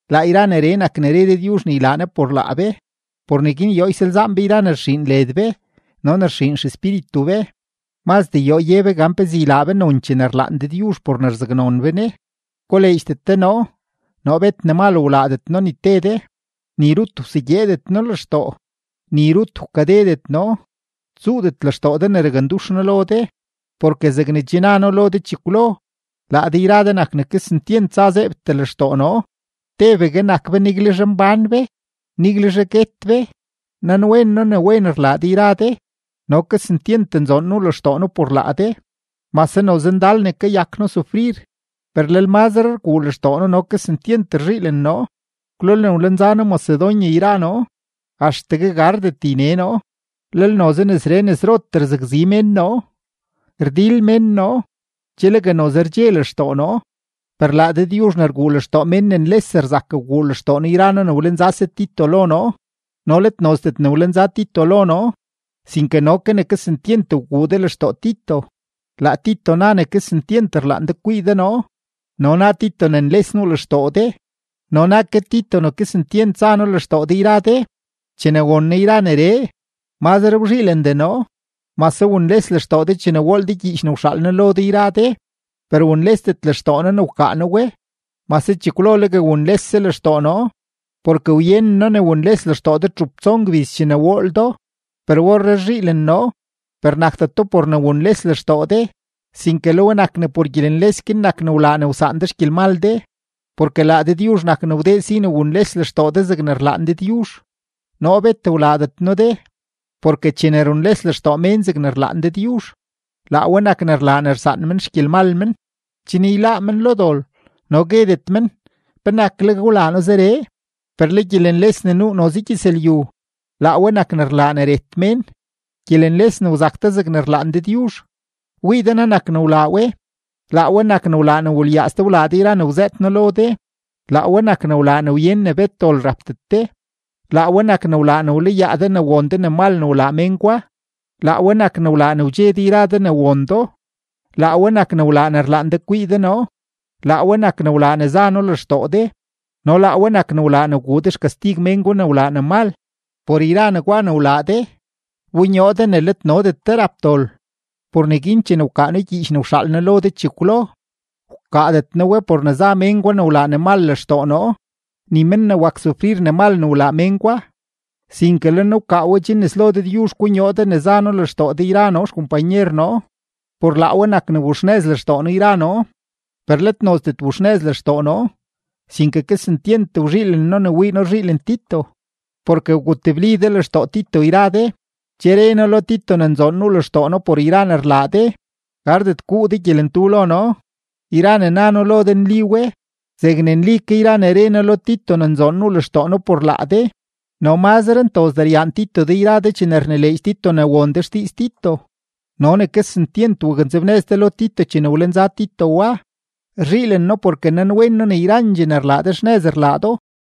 Laa yra neree nak ne re Dëdyuzh ne ylaa Ne por laa be. Por neguin yoo ysalzaan be yra ne rxiin led be no ne rxiin xespíritu be; mazdee yoo ye be gan pezee ylaa be nonchee ne rlaan Dëdyuzh por ne rzaknon be Ne. ¡Koleedxdet de noo! Noo bet ne mal wlaadet noo de ni te de, ni rut wsegyeedet noo lextoo, ni rut wkadedet noo. Tsuudet lextoo de ne rakndux noo lo de, porke zegne che na noo lo de chekwlo, laa de yra de nak ne kesentyent za zeebtee lextoo noo; tebegue nak be, niguelzhe mbán be, niguelzhe guet be. Nanwen noo ne wen rlaa de yra de, no kesentyent nzoon nuu lextoo noo por laa de. Mase noze ndal ne kayak noo sufrir, per lel mazre rguu lextoo noo no kesentyent rzhiilen noo. Kwlolne wlenza noo Macedonia yra noo, axtegue gardet yne noo, lel noze nesree nesrotee rzakzi mén noo; rdil mén noo, che legue noze rdxe lextoo noo. Per laa Dëdyuzh ne rguu lextoo mén ne nles rzak wguu lextoo noo yra noo ne wlenzase Tito lo noo, no let nozdet ne wlenza Tito lo noo, sinke no ke ne kesentyent wguu de lextoo Tito. Laa Tito na ne kesentyent rlaan de kwii de noo no na Tito ne nles nuu lextoo de no na ke Tito ne kesentyent za noo lextoo de yra de. Chene won noo yra neree, mazre wzhiilendee noo. Mase wunles lextoo de chene wool de gyiich ne wxaal noo lo de yra de, per wunlesdet lextoo noo ne wkaa noo we; mase chekwlo legue wunlese lextoo noo, porke wyenen noo ne wunles lextoo de txup tson gbiz chene wool do, per orree rzhiilen noo; per nakdeto por ne wunles lextoo de, sinke le we nak ne por gyelenles guin nak ne wlaa ne wsaan de xgyelmal de. Porke laa Dëdyuzh nak ne wdee si ne wunles lextoo de zegne rlaan Dëdyuzh; noo bet wlaadet noo de. Porke chene runles lextoo mén zegne rlaan Dëdyuzh, laa we nak ne rlaa ne rsaan men xgyelmal men, chen yláá men lo dol no guedet men, ¿penakleg wlaa noo zeree? Per le gyelenles ne nuu noze gyëzlyu, laa we nak ne rlaa ne ret mén. Gyelenles ne wzak de zegne rlaan Dëdyuzh, ¡wii de naa nak ne wlaa we! Laa we nak ne wlaa ne wulyaaz de wlaa de yra ne wzëët noo lo de, laa we nak ne wlaa ne wyen ne bet dol rapdet de, laa we nak ne wlaa ne wlayaa de ne won de ne mal ne wlaa mén gwa, laa we nak ne wlaa ne wdxe de yra de ne won do, laa we nak ne wlaa ne rlaan de kwii de noo, laa we nak ne wlaa ne za noo lextoo de, no laa we nak ne wlaa ne wguu de xkastig mén gwa ne wlaa ne mal. Por yra negwa ne wlaa de, wbonyoo de ne let nodet de rap dol. Por neguin chene wkaa noo gyiich ne wxaal noo lo de chekwlo, wkaadet noo we por ne za mén gwa ne wlaa ne mal lextoo noo ni men ne wak sufrir ne mal ne wlaa mén gwa, sinke le noo wkaa we chen nes lo Dëdyuzh konyoo de ne za noo lextoo de yra noo xkompanyer noo. Por laa we nak ne wuxnëz lextoo noo yra noo. Per let nozdet wuxnëz lextoo noo, sinke kesentyent wzhiilen noo ne wii noo ne rzhiilen Tito, porke wgutebli de lextoo Tito yra de. Che re noo lo Tito ne nzoon nuu lextoo noo por yra ne rlaa de yra de, gardet guu de gyelentu lo noo. Yra ne na noo lo de nli we zegne nli ke yra ne re noo lo Tito ne nzoon nuu lextoo noo por laa de. No mazre ntozdee ryaan Tito de yra de chene rnileedx Tito ne won de xdiiz Tito no ne kesentyent waknzebnëz de lo Tito chene wlenza Tito wa. Rzhiilen noo porke nanwen noo ne yrandxee ne rlaa de, xnëz rlaa do.